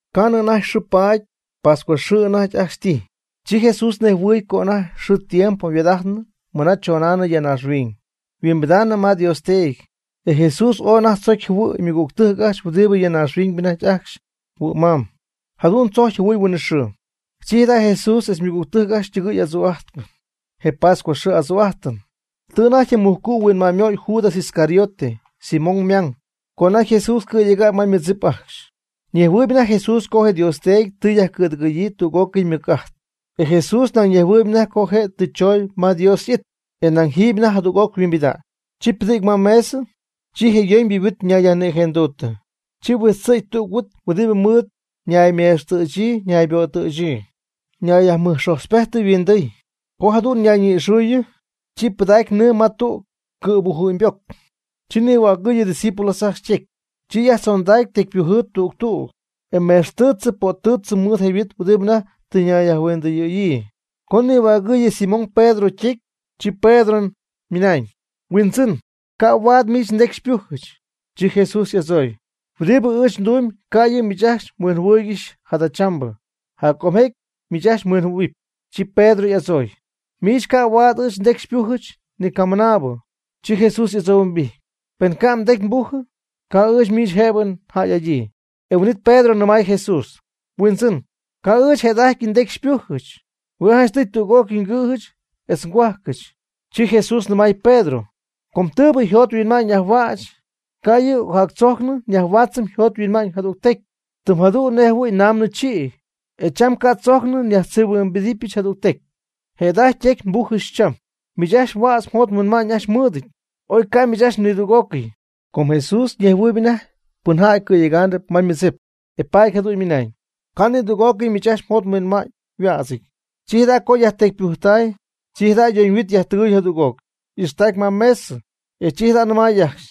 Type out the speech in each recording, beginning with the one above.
Ca'nɨ anajty xɨɨ paady, pascuaxɨɨ anajty ajcxy tijy. Chi Jesús ñejhuɨɨyb co anajty yxɨɨ ytiempo yhuaad'ajtnɨ mɨna chonaanɨ ya naaxhuiñ yhuimbidaanɨ ma Dios Teedy. E Jesús ooy anajty tzocy jɨhuɨ̈y ymɨgügtɨjc ajcxy huɨdibɨ ya naaxhuiñ anajty ajcxy huɨ'ma'ñ. Jadu'n tzocy jɨhuɨ̈y huinɨxɨɨ. Chi jada' Jesús etz ymɨgügtɨjc ytɨgɨɨy ajcxy adzuu'ajtp (je pascuaxɨɨ adzu'ajtɨn). Tɨ anajty je mujcu' huinma'ñymöy Judas Iscariote, Simón ymang, co anajty Jesús cɨ̈yega'ñ ma ymɨdzip ajcxy. Ñejhuɨɨyb anajty Jesús co je Dios Teedy tɨ yajcɨ̈dɨgɨ̈yii tüg'ócɨy ymɨc'ajt, e Jesús nañ ñejhuɨɨyb anajty co je' tɨ chooñ ma Dios y'it, e nañ jiiby anajty jadüg'oc yhuimbida'ñ. Chi ypɨdɨ̈gy ma mesɨ, chi je yoñybɨ yhuit ñayyajnïjenduuttɨ. Chi huijtzɨ̈gy tüg huit huɨdibɨ mɨɨd ñaymextɨɨtzɨ nayböttɨɨtzɨ, ñayyajmɨjxojtzpejtɨ yhuindɨɨy. Co jadu'n ñayñi'ixɨɨyɨ, chi pɨdacy nɨɨ ma tüg cɨ̈bujɨ'ñyboc. Chi nihuägɨɨyɨ ydiscípulos ajcxy ytecy. Chi yajtzondacy tecypujɨɨ tüg tüg, e mextɨɨch pöttɨɨch mɨɨd je huit huɨdibɨ anajty tɨ ñayyajhuindɨyɨ̈yii. Co nihuägɨɨyɨ Simón Pedro ytecy, chi Pedro ymɨnañ: ―Huindzɨn, ca' huaad miich ndecy xypujɨch. Chi Jesús y'adzooy: ―Huɨdibɨ ɨɨch ndumyb ca' yɨ' miich ajcxy mhuinjɨhuɨɨygɨxy jadachambɨ, jaccomjecy miich ajcxy mhuinjɨhuɨ̈huɨpy. Chi Pedro y'adzooy: ―Miich ca' huaad ɨɨch ndecy xypujɨch ni camɨnaabɨ. Chi Jesús y'adzohuimbijty: ―Pen ca' mdecy nbujɨ, ca' ɨɨch miich jëbɨ njäy'adyii. E huin'it Pedro nɨmay Jesús: ―Huindzɨn, ca' ɨɨch jëda'ajty ndecy xypújɨbɨch, hue' janchtɨy tüg'ócɨy ngɨ̈jɨch etz ngohuajcɨch. Chi Jesús nɨmay Pedro: ―Com tɨɨbɨ mjot mhuinma'ñ yajhuäch, ca' yɨ' ocjactzojcnɨ yajhuädzɨpy mjot mhuinma'ñ jadügtecy. Tɨm jadu'n nej jɨhuɨ̈y naamnɨ chïy, e cham ca' tzojcnɨ yajtzïhuɨbyɨch jadügtecy. Jëda'ajty mdecy nbujɨch cham. Miich ajcxy huädz mjot mhuinma'ñ ajcxy mmɨɨdɨñ, oy ca' miich ajcxy nidüg'ócɨy. Com Jesús ñejhuɨɨyb anajty pɨnjäy cɨ̈yegaanɨp ma ymɨdzip, e paady jadu'n ymɨnañ: ―Ca' ni tüg'ócɨy miich ajcxy mjot mhuinma'ñ yhuädzɨty. Chi jada' co yajtecypujtay, chi jada' yoñyhuit yajtɨgɨɨy jadüg'oc. Y'ixtacy ma mesɨ, e chi jada' nɨmay ajcxy: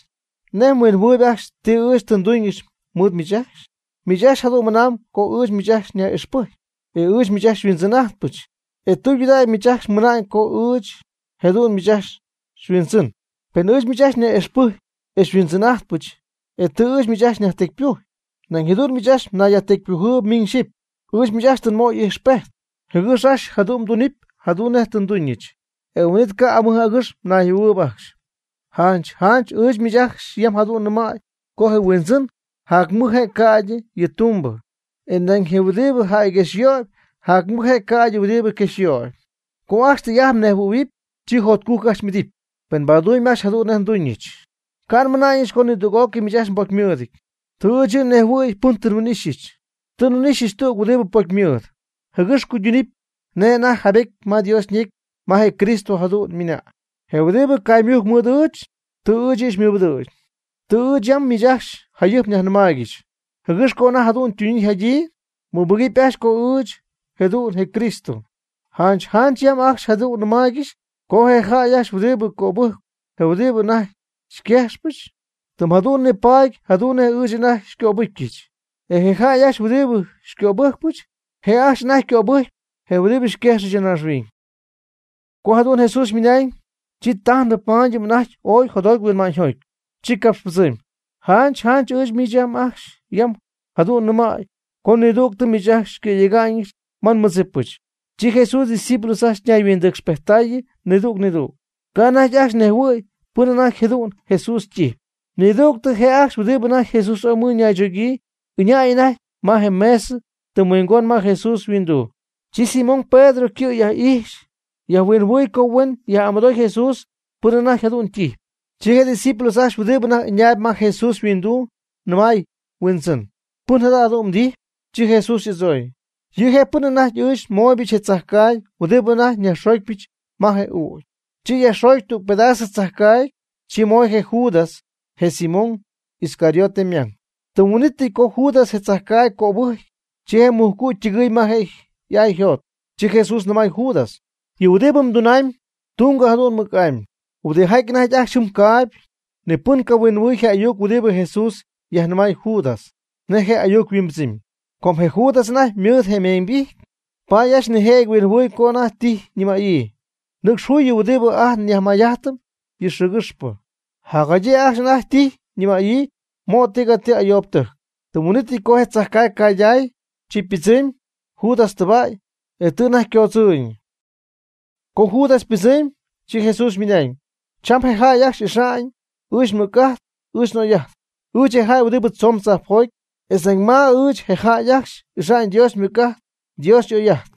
―¿Nej mhuinjɨhuɨɨyb ajcxy ti ɨɨch tɨ nduñɨch mɨɨd miich ajcxy? Miich ajcxy jadu'n mɨnamb co ɨɨch miich ajcxy myaj'ixpɨjcy, etz ɨɨch miich xyhuindzɨn'ajtpɨch. E tɨydudägy miich ajcxy mɨna'ñ com ɨɨch jëdu'n miich ajcxy mHuindzɨn. Pen ɨɨch miich ajcxy nyaj'ixpɨjcyp etz xyhuindzɨn'ajtpɨch, e tɨ ɨɨch miich ajcxy nyajtecypujy, nañ jadu'n miich ajcxy myajtecypujɨɨyb miñ xyɨpy. Ɨɨch miich ajcxy tɨ nmöy tüg ijxpejt, jɨgɨx ajcxy jadu'n mdunɨpy jadu'n nej tɨ nduñɨch, e huin'it ca' amɨj agɨx nayjɨhuɨ̈huɨɨyb ajcxy. Janch janch ɨɨch miich ajcxy yam jadu'n nnɨmäy co je huindzɨn jac mɨj je' ca'ydɨ yɨ' ytumbɨ. E nañ je' huɨdibɨ yajquejxyöyb jac mɨj je' ca'ydɨ huɨdibɨ quejxyöyb. Co ajcxy tɨy'ajt mnejhuɨ̈huɨpy, chi jotcujc ajcxy m'idɨpy, pen mbadumyb ajcxy jadu'n nej nduñɨch. Ca' nmɨna'ñɨch co nidüg'ócɨy miich ajcxy mbocymɨɨdɨty. Tɨ ɨɨch yɨ' nnejhuɨ̈y pɨn tɨ nhuin'ixyɨch. Tɨ nhuin'ixyɨch tüg huɨdibɨ pocymɨɨd, jɨgɨx cuyduunɨp nej anajty yjaybetyɨty ma Dios ñecy ma je Cristo jadu'n ymɨna'ñ: “Yɨ' huɨdibɨ caymujcp mɨɨd ɨɨch, tɨ ɨɨch yɨ' xymɨbɨdɨ̈gy.” Tɨ ɨɨch yam miich ajcxy jayɨjp nyajnɨmaaygɨxy, jɨgɨx co anajty jadu'n ytunyii yjadyii, mmɨbɨgɨpy ajcxy co ɨɨch jëdu'n je Cristo. Janch janch yam ajcxy jadu'n nnɨmaaygɨxy co je jäy ajcxy huɨdibɨ cöbɨjcp je huɨdibɨ anajty nguejxypɨch, tɨm jadu'n nipaady jadu'n nej ɨɨch anajty xycöbɨjcyɨch. E je jäy ajcxy huɨdibɨ xycöbɨjcpɨch, je' ajcxy anajty ycöbɨjcyp je' huɨdibɨ xyquejxɨch ya naaxhuiñ. Co jadu'n Jesús ymɨnañ, chi tajnɨp mayñɨp anajty ooy jotjoty huinma'ñyjoty, chi capxypɨdzɨmy: ―Janch janch ɨɨch miich ajcxy yam jadu'n nɨmäy co nidügtɨ miich ajcxy xycɨ̈yega'ñɨch ma nmɨdzipɨch. Chi Jesús ydiscípulos ajcxy ñayhuindɨcxpejttaayɨ nidüg nidüg. Ca' anajty ajcxy nejhuɨ̈y pɨn anajty jëdu'n Jesús ytijyp. Nidügtɨ je' ajcxy huɨdibɨ anajty Jesús ooy mɨɨd ñaychogyii ɨñäy anajty ma mesɨ tɨm huingon ma Jesús yhuinduu. Chi Simón Pedro ycɨ' yaj'ijxy yajhuinjɨhuɨy co huen yaj'amɨdooy Jesús pɨn anajty jadu'n ytijyp. Chi je discípulos ajcxy huɨdibɨ anajty ɨñaayb ma Jesús yhuinduu nɨmay yhuindzɨn: ―¿Pɨn jadu'n mdijyp? Chi Jesús y'adzooy: ―Yɨ' je' pɨn anajty ɨɨch nmooybɨch yɨ tzajcaagy huɨdibɨ anajty nyajxoocpyɨch ma je ügy. Chi yajxoogy tüg pedasɨ tzajcaagy, chi moy je Judas, je Simón Iscariote ymang. Tɨm huin'ítɨy co Judas je tzajcaagy cöbɨjcy, chi je mujcu' ytɨgɨɨy ma je' y'ay yjot. Chi Jesús nɨmay Judas: ―Yɨ huɨdibɨ mdunamyb, tungo jadu'n mɨc'amy. Huɨdijaty anajty ajcxy jɨm caayb, ni pɨn cahuinjɨhuɨy je ayuc huɨdibɨ Jesús yajnɨmay Judas, nej je ayuc yhuimbɨdzɨmy. Com je Judas anajty mɨɨd je meeñybijty, paady ajcxy nijëjɨty huinjɨhuɨy co anajty tijy ñɨmäyii: ―Nɨcx juy yɨ huɨdibɨ ajt nyajmayjajtɨm yɨ xɨɨgɨxpɨ. Jacjadyii ajcxy anajty tijy ñɨmäyii: ―Mo' tigatii ayoobɨtɨjc. Tɨm huin'ítɨy co je tzajcaagy cayday, chi ypɨdzɨmy Judas tɨba'y, e tɨ anajty ycoodzɨɨyñɨ. Co Judas ypɨdzɨmy, chi Jesús ymɨnañ: ―Cham je jäy ajcxy ixa'ñ ɨɨch nmɨc'ajt ɨɨch n'oy'ajt, ɨɨch je jäy huɨdibɨ tzoon tzajpjoty. Etz nañ ma ɨɨch je jäy ajcxy ixa'ñ Dios ymɨc'ajt Dios y'oy'ajt.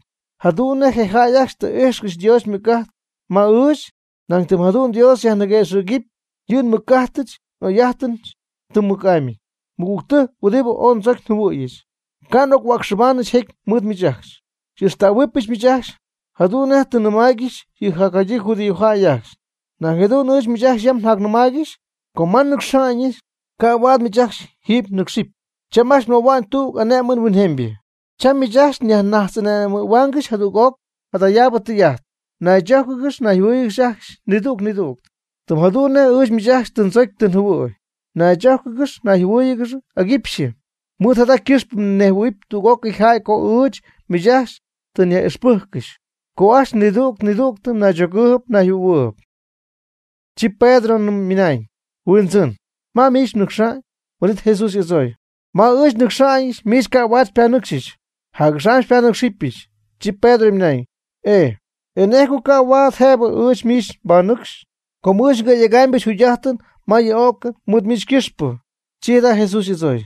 Jadu'n nej je jäy ajcxy tɨ ijxcɨxy Dios ymɨc'ajt ma ɨɨch, nañ tɨm jadu'n Dios yajniguëxɨ̈gɨpy yɨ nmɨc'ajtɨch n'oy'ajtɨch tɨm mɨc'amy. Mɨgügtɨjc huɨdibɨ ooy ndzocy njɨhuɨ̈yɨch, ca' n'ochuäcxɨbaanɨch jecy mɨɨd miich ajcxy. Xy'ixtähuɨbɨch miich ajcxy. Jadu'n nej tɨ nnɨmáaygɨxyɨch yɨ jacjadyii judíojäy ajcxy, nañ jadu'n ɨɨch miich ajcxy yam njacnɨmaaygɨxy co ma nnɨcxa'ñɨch, ca' huaad miich ajcxy jiiby mnɨcxcɨxy. Cham ajcxy nmöhua'ñ tüg ané'mɨn huinjemybɨ. Cham miich ajcxy nyajnajtz'ane'mɨ̈huaangɨxy jadüg'oc jadayaabɨ tɨy'ajt: Naychójcɨgɨx nayjɨhuɨ́ɨyɨgɨx ajcxy nidüg nidüg, tɨm jadu'n nej ɨɨch miich ajcxy tɨ ndzocy tɨ njɨhuɨ̈y. Naychójcɨgɨx nayjɨhuɨ́ɨyɨgɨx aguipxyɨ. Mɨɨd jada ycɨxpɨ ñejhuɨ̈huɨpy tüg'ócɨy jäy co ɨɨch miich ajcxy tɨ nyaj'ixpɨjccɨxy co ajcxy nidüg nidüg mnaychogɨɨyb mnayjɨhuɨ̈huɨɨyb. Chi Pedro nɨmay: ―Huindzɨn, ¿ma miich mnɨcxa'ñ? Huin'it Jesús y'adzooy: ―Ma ɨɨch nnɨcxa'ñɨch miich ca' huaad xypanɨcxyɨch. Jac'axam xypanɨ́cxɨbyɨch. Chi Pedro ymɨnañ: ―E ¿nej co ca' huaad jëbɨ ɨɨch miich nbanɨcxy? com ɨɨch ngɨ̈yegamyɨch njugy'ajtɨn ma yɨ o'cɨn mɨɨd miich ycɨxpɨ. Chi jada' Jesús y'adzooy: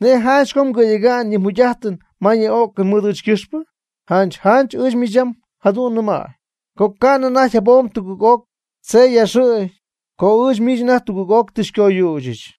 ―¿Nej janch co mgɨ̈yega'ñ yɨ mjugy'ajtɨn ma yɨ o'cɨn mɨɨd ɨɨch ycɨxpɨ? Janch janch ɨɨch miich ajcxy yam jadu'n nɨmäy, co ni ca'nɨ anajty jabom tugɨɨg'oc tzey yaaxɨ̈gy, co ɨɨch miich anajty tugɨɨg'oc tɨ xycoyüchɨch.